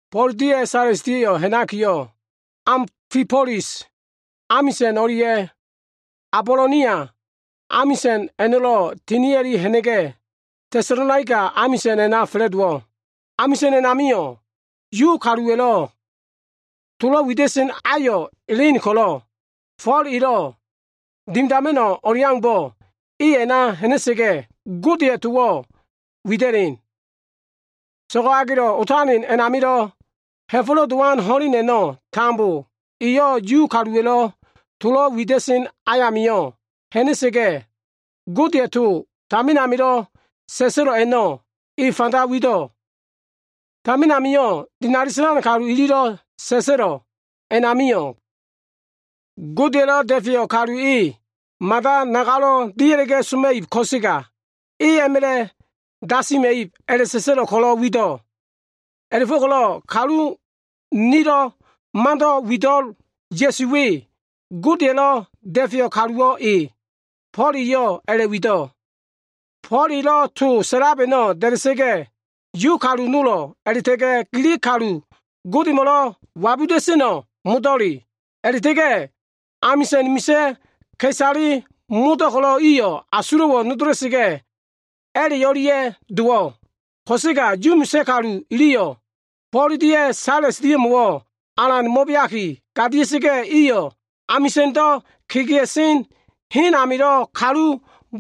Fo꞉l dia꞉ Sales dia꞉yo꞉ ha꞉nakiyo꞉, Afibolis amisa꞉n o꞉lia꞉ Abolonia amisa꞉n a꞉no꞉lo꞉ tinia꞉li ha꞉na꞉ga꞉, Tesalonaika amisa꞉n a꞉na fa꞉la꞉dowo꞉. Amisa꞉n a꞉namio꞉ Yu kaluwa꞉lo꞉ tolo꞉ wida꞉sen ayo꞉ elen ko꞉lo꞉, Fo꞉l elo꞉ dimidan o꞉leaumbo꞉ e a꞉na ha꞉na꞉sa꞉ga꞉, Godeya꞉ towo꞉ wida꞉len. So꞉go꞉ agelo꞉ otalen a꞉namio꞉, Ha꞉fo꞉lo꞉ Dowan ho꞉len a꞉no꞉ tambo eyo꞉ Yu kaluwa꞉lo꞉ tolo꞉ wida꞉sen ayamio꞉ ha꞉na꞉sa꞉ga꞉, Godeya꞉ to tamin amilo꞉ sa꞉sa꞉lo꞉ a꞉no꞉ eyo꞉ a꞉fanda wido꞉. Tamin amilo꞉ dinali sa꞉lan kalu ililo꞉ sa꞉sa꞉lo꞉ a꞉namio꞉, Godeya꞉lo꞉ Da꞉feyo꞉ Kalu e mada nagalo꞉ dia꞉la꞉ga꞉ soma꞉ib ko꞉sega e a꞉ma꞉la꞉ dasima꞉ib a꞉la꞉sa꞉sa꞉lo꞉ ko꞉lo꞉ wido꞉. A꞉la꞉fo꞉ko꞉lo꞉ kalu nilo꞉ mando꞉ wido꞉l Ya꞉su we, Godeya꞉lo꞉ Da꞉feyo꞉ Kaluwo꞉ e. Fo꞉l eyo꞉ a꞉la꞉wido꞉. Fo꞉l elo꞉ to sa꞉lab a꞉no꞉ da꞉da꞉sa꞉ga꞉, Yu kalu nolo꞉lo꞉, Gilig kalu Godemo꞉lo꞉ wabuda꞉seno꞉ modo꞉le a꞉no꞉lo꞉ a꞉la꞉ta꞉ga꞉ amisa꞉n amilo꞉ misa꞉ ka꞉isale nolo꞉lo꞉ iyo꞉ tambo asulo꞉wo꞉ nodola꞉sa꞉ga꞉, a꞉la꞉ o꞉lia꞉ dowo꞉. Ko꞉sega Yu misa꞉ kalu iliyo꞉ Fo꞉l dia꞉ Sales dia꞉mo꞉wo꞉ alan mo꞉beaki gadia꞉sa꞉ga꞉, iyo꞉ amisa꞉ndo꞉ kegea꞉sen hen amilo꞉ kalu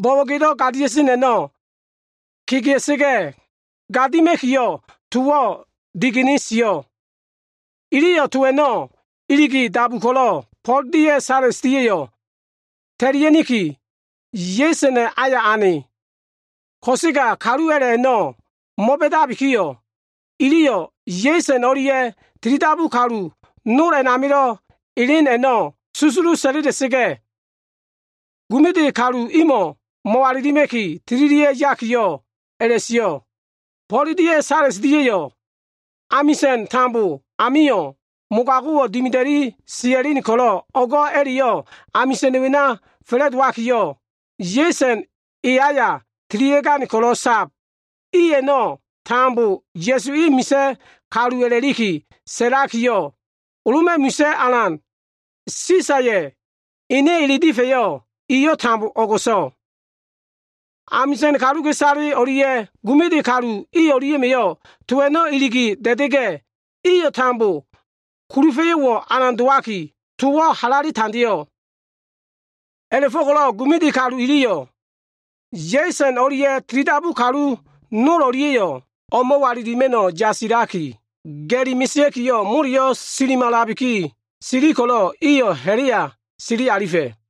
bo꞉bo꞉gedo꞉ gadia꞉sen a꞉no꞉ kegea꞉sa꞉ga꞉, gadima꞉kiyo꞉ towo꞉ digene sio꞉. Iliyo꞉ to a꞉no꞉ iligi dabu ko꞉lo꞉, Fo꞉l dia꞉ Sales dia꞉yo꞉ ta꞉lia꞉niki, Yesona꞉ aya ane. Ko꞉sega kalu a꞉la꞉ a꞉no꞉ mo꞉ba꞉dabikiyo꞉, iliyo꞉ Yeson o꞉lia꞉ tilidabu kalu nol a꞉namilo꞉ elen a꞉no꞉ susulu sa꞉la꞉la꞉sa꞉ga꞉, gumiti kalu imo꞉ mo꞉walilima꞉ki tililia꞉ yakiyo꞉, a꞉la꞉sio꞉, “Fo꞉l dia꞉ Sales dia꞉yo꞉ amisa꞉n tambo amio꞉ mogago꞉wo꞉ dimida꞉li sia꞉len ko꞉lo꞉, o꞉go꞉ a꞉la꞉yo꞉ amisa꞉n wena fa꞉la꞉dowabiki, Yeson e aya tililia꞉gane ko꞉lo꞉ sab. I a꞉no꞉ tambo Ya꞉su e misa꞉ kalu a꞉la꞉liki sa꞉lakiyo꞉, Loma꞉ misa꞉ alan Sisaya꞉ ene ele difa꞉yo꞉ ili tambo o꞉go꞉so꞉.” Amisa꞉n kaluka꞉isale o꞉lia꞉ gumiti kalu i o꞉lia꞉ma꞉yo꞉ to a꞉no꞉ iligi da꞉da꞉ga꞉, iyo꞉ tambo kulufa꞉yo꞉wo꞉ alan dowaki, towo꞉ halale tandeo꞉. A꞉la꞉fo꞉ko꞉lo꞉ gumiti kalu iliyo꞉, Yeson o꞉lia꞉ tilidabu kalu nol o꞉lia꞉yo꞉ o꞉mo꞉walilima꞉no꞉ yasilaki ga꞉li mesea꞉kiyo꞉, moleyo꞉ silimalabiki, sili ko꞉lo꞉ iyo꞉ ha꞉la꞉ya sili alifa꞉.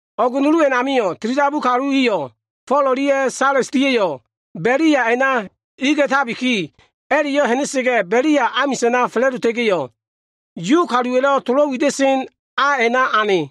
O꞉g nulu a꞉namio꞉, tilidabu kalu iyo꞉ Fo꞉l dia꞉ Sales dia꞉yo꞉ Belia a꞉na iliga꞉tabiki, a꞉la꞉yo꞉ ha꞉na꞉sa꞉ga꞉ Belia amisa꞉na fa꞉la꞉dota꞉ga꞉yo꞉, Yu kaluwa꞉lo꞉ tolo꞉ wida꞉sen a a꞉na ane.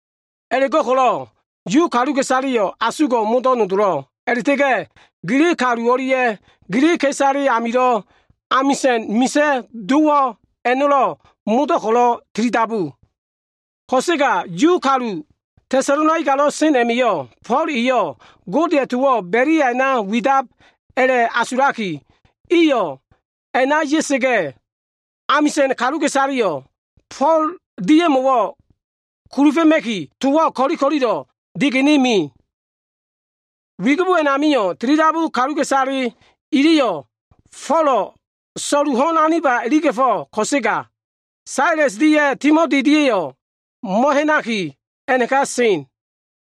A꞉la꞉go꞉ko꞉lo꞉ Yu kaluka꞉isaleyo꞉ asugo꞉ modo꞉ nodolo꞉, a꞉la꞉ta꞉ga꞉ Gilig kalu o꞉lia꞉ Gilig ka꞉isale amilo꞉ amisa꞉n misa꞉ dowo꞉ a꞉no꞉lo꞉ modo꞉ ko꞉lo꞉ tilidabu. Ko꞉sega Yu kalu Tesalonaikalo꞉ sen a꞉ma꞉yo꞉, Fo꞉l eyo꞉ Godeya꞉ towo꞉ Belia a꞉na widab a꞉la꞉asulaki, iyo꞉ a꞉na ya꞉sa꞉ga꞉, amisa꞉n kaluka꞉isaleya꞉yo꞉ Fo꞉l dia꞉mo꞉wo꞉ kulufa꞉ma꞉ki, towo꞉ ko꞉li ko꞉lilo꞉ digene me. Wigibo a꞉namio꞉, tilidabu kaluka꞉isale iliyo꞉ Fo꞉lo꞉ so꞉lu ho꞉n aniba iliga꞉fo꞉ ko꞉sega, Sales dia꞉ Timoti dia꞉yo꞉ mo꞉ha꞉naki, a꞉naka sen.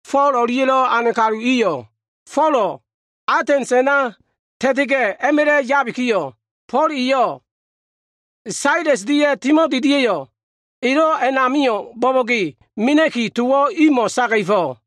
Fo꞉l o꞉lia꞉lo꞉ ane kalu iyo꞉ Folo꞉ Atens a꞉na ta꞉ta꞉ga꞉, a꞉ma꞉la꞉ yabikiyo꞉, Fo꞉l eyo꞉ Sales dia꞉ Timoti dia꞉yo꞉ elo꞉ amio꞉ bo꞉bo꞉ge mena꞉ki, towo꞉ imo꞉ saga꞉fo꞉.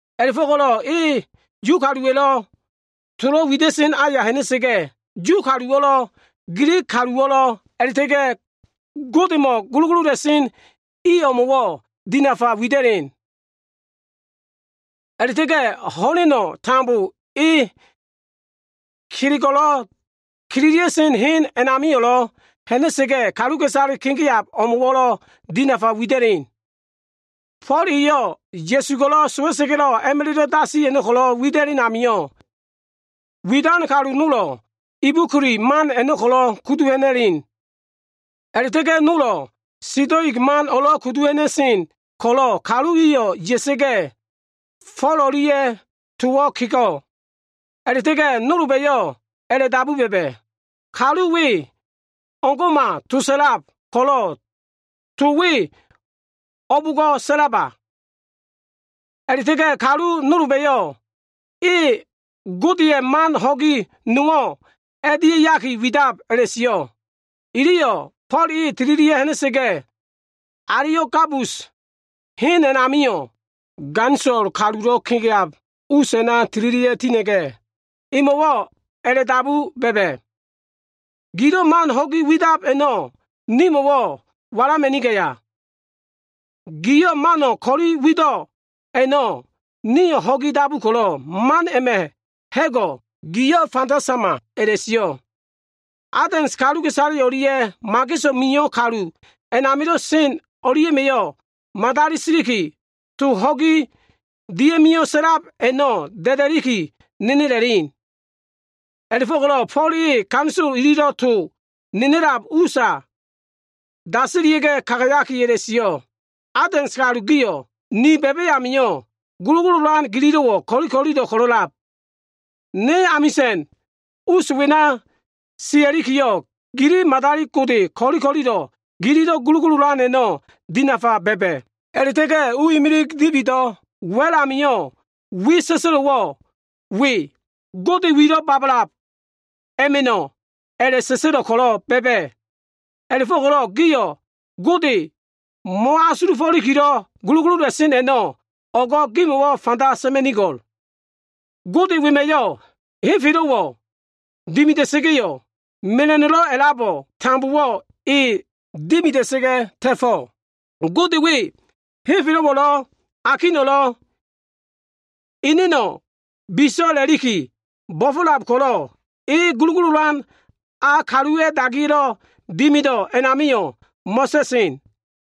A꞉la꞉fo꞉ko꞉lo꞉ e Yu kaluwa꞉lo꞉ tolo꞉ wida꞉sen aya ha꞉na꞉sa꞉ga꞉, Yu kaluwo꞉lo꞉ Gilig kaluwo꞉lo꞉, a꞉la꞉ta꞉ga꞉ Godemo꞉ gulugulula꞉sen i o꞉mo꞉wo꞉ dinafa wida꞉len. A꞉la꞉ta꞉ga꞉ ho꞉leno꞉ tambo e kelego꞉lo꞉ kililia꞉sen hen a꞉namio꞉lo꞉ ha꞉na꞉sa꞉ga꞉, kaluka꞉isale kegea꞉lab o꞉mo꞉wo꞉lo꞉ dinafa wida꞉len. Fo꞉l eyo꞉ Ya꞉su ko꞉lo꞉ sowa꞉sa꞉ga꞉lo꞉ a꞉ma꞉lo꞉ dasi a꞉no꞉ ko꞉lo꞉ wida꞉len amio꞉, widan kalu nolo꞉ Ebikuli man a꞉no꞉ kudu ha꞉na꞉sen a꞉la꞉ta꞉ga꞉ nolo꞉ Sitoig man o꞉lo꞉ kudu ha꞉na꞉sen ko꞉lo꞉, kalu iyo꞉ ya꞉sa꞉ga꞉, Fo꞉l o꞉lia꞉yo꞉ towo꞉ kego꞉. A꞉la꞉ta꞉ga꞉ nolba꞉yo꞉ a꞉la꞉dabu ba꞉ba꞉, “Kalu we o꞉ngo꞉ma to sa꞉lab ko꞉lo꞉, to we o꞉bo꞉ngo꞉ sa꞉laba?” A꞉la꞉ta꞉ga꞉ kalu nolba꞉yo꞉, “E godeya꞉ man ho꞉gi nowo꞉ a꞉dia꞉yaki widab” a꞉la꞉sio꞉. Iliyo꞉ Fo꞉l e tililia꞉ ha꞉na꞉sa꞉ga꞉, Aleo꞉bagus hen a꞉namio꞉, ganisolo kalulo꞉ kegeab us a꞉na tililia꞉ tina꞉ga꞉, emo꞉wo꞉ a꞉la꞉dabu ba꞉ba꞉, “Gilo꞉ man ho꞉gi wido꞉ a꞉no꞉ nimo꞉wo꞉ walama꞉nigaya? Giyo꞉ mano꞉ ko꞉li wido꞉ amio꞉, nio꞉ ho꞉gi dabu ko꞉lo꞉ a꞉ma꞉ ha꞉go꞉ giyo꞉ fanda sama” a꞉la꞉sio꞉. Atens kaluka꞉isale o꞉lia꞉ mageso꞉ mio꞉ kalu a꞉namilo꞉ sen o꞉lia꞉yo꞉ madali siliki, to ho꞉gi dia꞉mio꞉ sa꞉lab a꞉no꞉ da꞉da꞉liki nenela꞉len. A꞉la꞉fo꞉ko꞉lo꞉ Fo꞉l e ganisolo ili tolo꞉ nenela꞉lab usa dasilia꞉ga꞉ kagayaki a꞉la꞉sio꞉, “Atens kalu giyo꞉, ni ba꞉ba꞉ amio꞉, gulugululan gililo꞉wo꞉ ko꞉li ko꞉lilo꞉ ko꞉lo꞉lab. Ne amisa꞉n us wena sia꞉likiyo꞉, gili madali gode ko꞉li ko꞉lilo꞉ gililo꞉ gulugululan a꞉no꞉ dinafa ba꞉ba꞉. A꞉la꞉ta꞉ga꞉ u kegene dibido꞉ imilig wa꞉l amilo꞉ wi sa꞉sa꞉lo꞉wo꞉ we ‘Gode Wilo꞉ Babalab a꞉ma꞉no꞉’ a꞉la꞉sa꞉sa꞉lo꞉ ko꞉lo꞉ ba꞉ba꞉. A꞉la꞉fo꞉ko꞉lo꞉ giyo꞉ Godeyo꞉ mo꞉asulufo꞉likilo꞉ gulugulula꞉sen a꞉no꞉ o꞉go꞉ gimo꞉wo꞉ fanda sa꞉ma꞉nigo꞉l. “Gode wema꞉yo꞉ henfelo꞉wo꞉ dimida꞉sa꞉ga꞉, mela꞉no꞉lo꞉ a꞉labo꞉ tambowo꞉ e dimida꞉sa꞉ga꞉ ta꞉fo꞉. Gode we henfelo꞉wo꞉lo꞉, akino꞉lo꞉ eneno꞉ biso꞉ a꞉la꞉liki bo꞉fo꞉lab ko꞉lo꞉, e gulugululan a, kaluwa꞉ dagiya꞉lo꞉ dimido꞉ a꞉namio꞉ mo꞉ta꞉sen.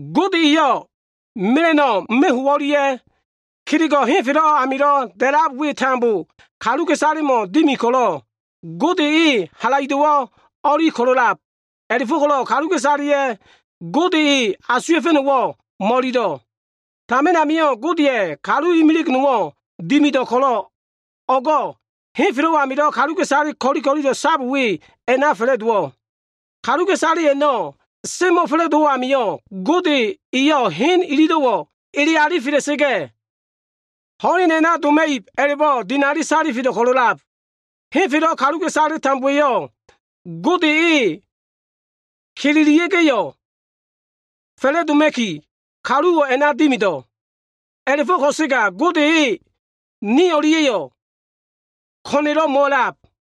Gode eyo꞉ mela꞉no꞉ meho꞉ o꞉lia꞉ kelego꞉ henfelo꞉ amilo꞉ a꞉lab we tambo kaluka꞉isalemo꞉ dimi ko꞉lo꞉, Gode e halaido꞉wo꞉ o꞉li ko꞉lo꞉lab. A꞉la꞉fo꞉ko꞉lo꞉ kaluka꞉isaleya꞉yo꞉ Gode e ko꞉lo꞉ a꞉asuwa꞉fa꞉no꞉wo꞉ mo꞉ililo꞉. Tamin amio꞉ Godeya꞉ kalu imilig nowo꞉ dimido꞉ ko꞉lo꞉ o꞉go꞉ henfelo꞉ amilo꞉ kaluka꞉isale ko꞉li ko꞉lilo꞉ sab we a꞉na fa꞉la꞉dowo꞉. Kaluka꞉isale a꞉no꞉ semo꞉fa꞉la꞉dowo꞉ amio꞉, Gode eyo꞉ hen ililo꞉wo꞉ ele alifela꞉sa꞉ga꞉, ho꞉len a꞉na doma꞉ib a꞉la꞉bo꞉ dinali da꞉fe salifelo꞉ ko꞉lo꞉lab. Henfelo꞉ kaluka꞉isale tambowa꞉yo꞉ Gode e kelelia꞉ga꞉yo꞉ fa꞉la꞉doma꞉ki, kaluwo꞉ a꞉na dimido꞉. A꞉la꞉fo꞉ ko꞉sega, Gode e ni o꞉lia꞉yo꞉ ko꞉na꞉lo꞉ mo꞉a꞉lab.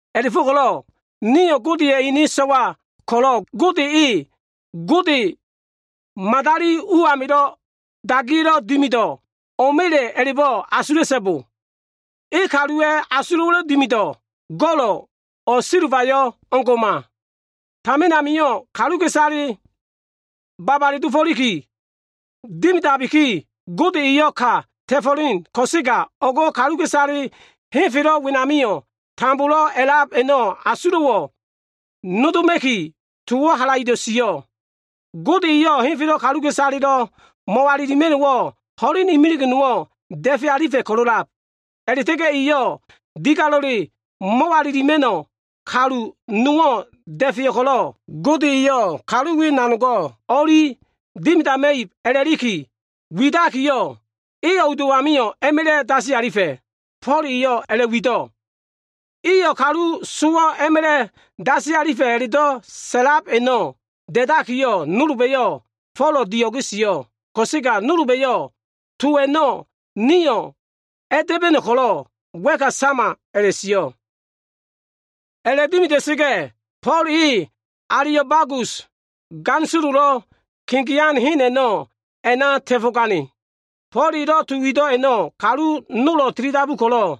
“A꞉la꞉fo꞉ko꞉lo꞉ nio꞉ Godeya꞉ ene so꞉wa ko꞉lo꞉ Gode e, gode madali u amilo꞉ dagiya꞉lo꞉ dimido꞉ o꞉ma꞉le a꞉la꞉bo꞉ asula꞉so꞉bo. E kaluwa꞉ asulo꞉wa꞉lo꞉ dimido꞉ go꞉lo꞉ o꞉ silbayo꞉ o꞉ngo꞉ma. Tamin amio꞉ kaluka꞉isaleyo꞉ babale dofo꞉liki dimida꞉labikiyo꞉, Gode eyo꞉ ka ta꞉fo꞉len ko꞉sega, o꞉go꞉ kaluka꞉isale tambo henfelo꞉ wenamilo꞉ a꞉lab a꞉no꞉ asulo꞉wo꞉ nodoma꞉ki, towo꞉ halaido꞉ sio꞉. Gode eyo꞉ henfelo꞉ kaluka꞉isalelo꞉ mo꞉walilima꞉no꞉wo꞉ ho꞉len imilig nowo꞉ da꞉fe alifa꞉ ko꞉lo꞉lab. A꞉la꞉ta꞉ga꞉ eyo꞉ digalelo꞉ mo꞉walilima꞉no꞉ kalu nowo꞉ da꞉feyo꞉ ko꞉lo꞉, Gode eyo꞉ kalu we nanogo꞉ o꞉li dimidama꞉ib a꞉la꞉liki widakiyo꞉, e sowo꞉ a꞉no꞉ a꞉ma꞉la꞉ a꞉dasi alifa꞉.” Fo꞉l eyo꞉ a꞉la꞉wido꞉. Iyo꞉ kalu sowo꞉ a꞉ma꞉la꞉ dasi a꞉la꞉do꞉ sa꞉lab a꞉no꞉ da꞉dakiyo꞉, nolba꞉yo꞉ Folo꞉ dio꞉ge sio꞉ ko꞉sega, nolba꞉yo꞉ “To a꞉no꞉ nio꞉ a꞉da꞉ba꞉no꞉ ko꞉lo꞉ wa꞉ka sama” a꞉la꞉sio꞉. A꞉la꞉dimida꞉sa꞉ga꞉, Fo꞉l e Aleo꞉bagusa꞉ ganisololo꞉ kegea꞉sen hen a꞉no꞉ a꞉na ta꞉fo꞉gane. Fo꞉l elo꞉ to wido꞉ a꞉no꞉ kalu nolo꞉ tilidabu ko꞉lo꞉,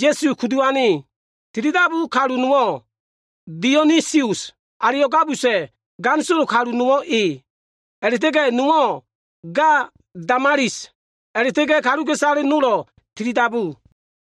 Ya꞉su kudu ane. Tilidabu kalu nowo꞉ Dionisus, Aleo꞉bagusa꞉ ganisolo kalu nowo꞉ e. A꞉la꞉ta꞉ga꞉ nowo꞉ ga Damalis, a꞉la꞉ta꞉ga꞉ kaluka꞉isale nolo꞉lo꞉ tilidabu.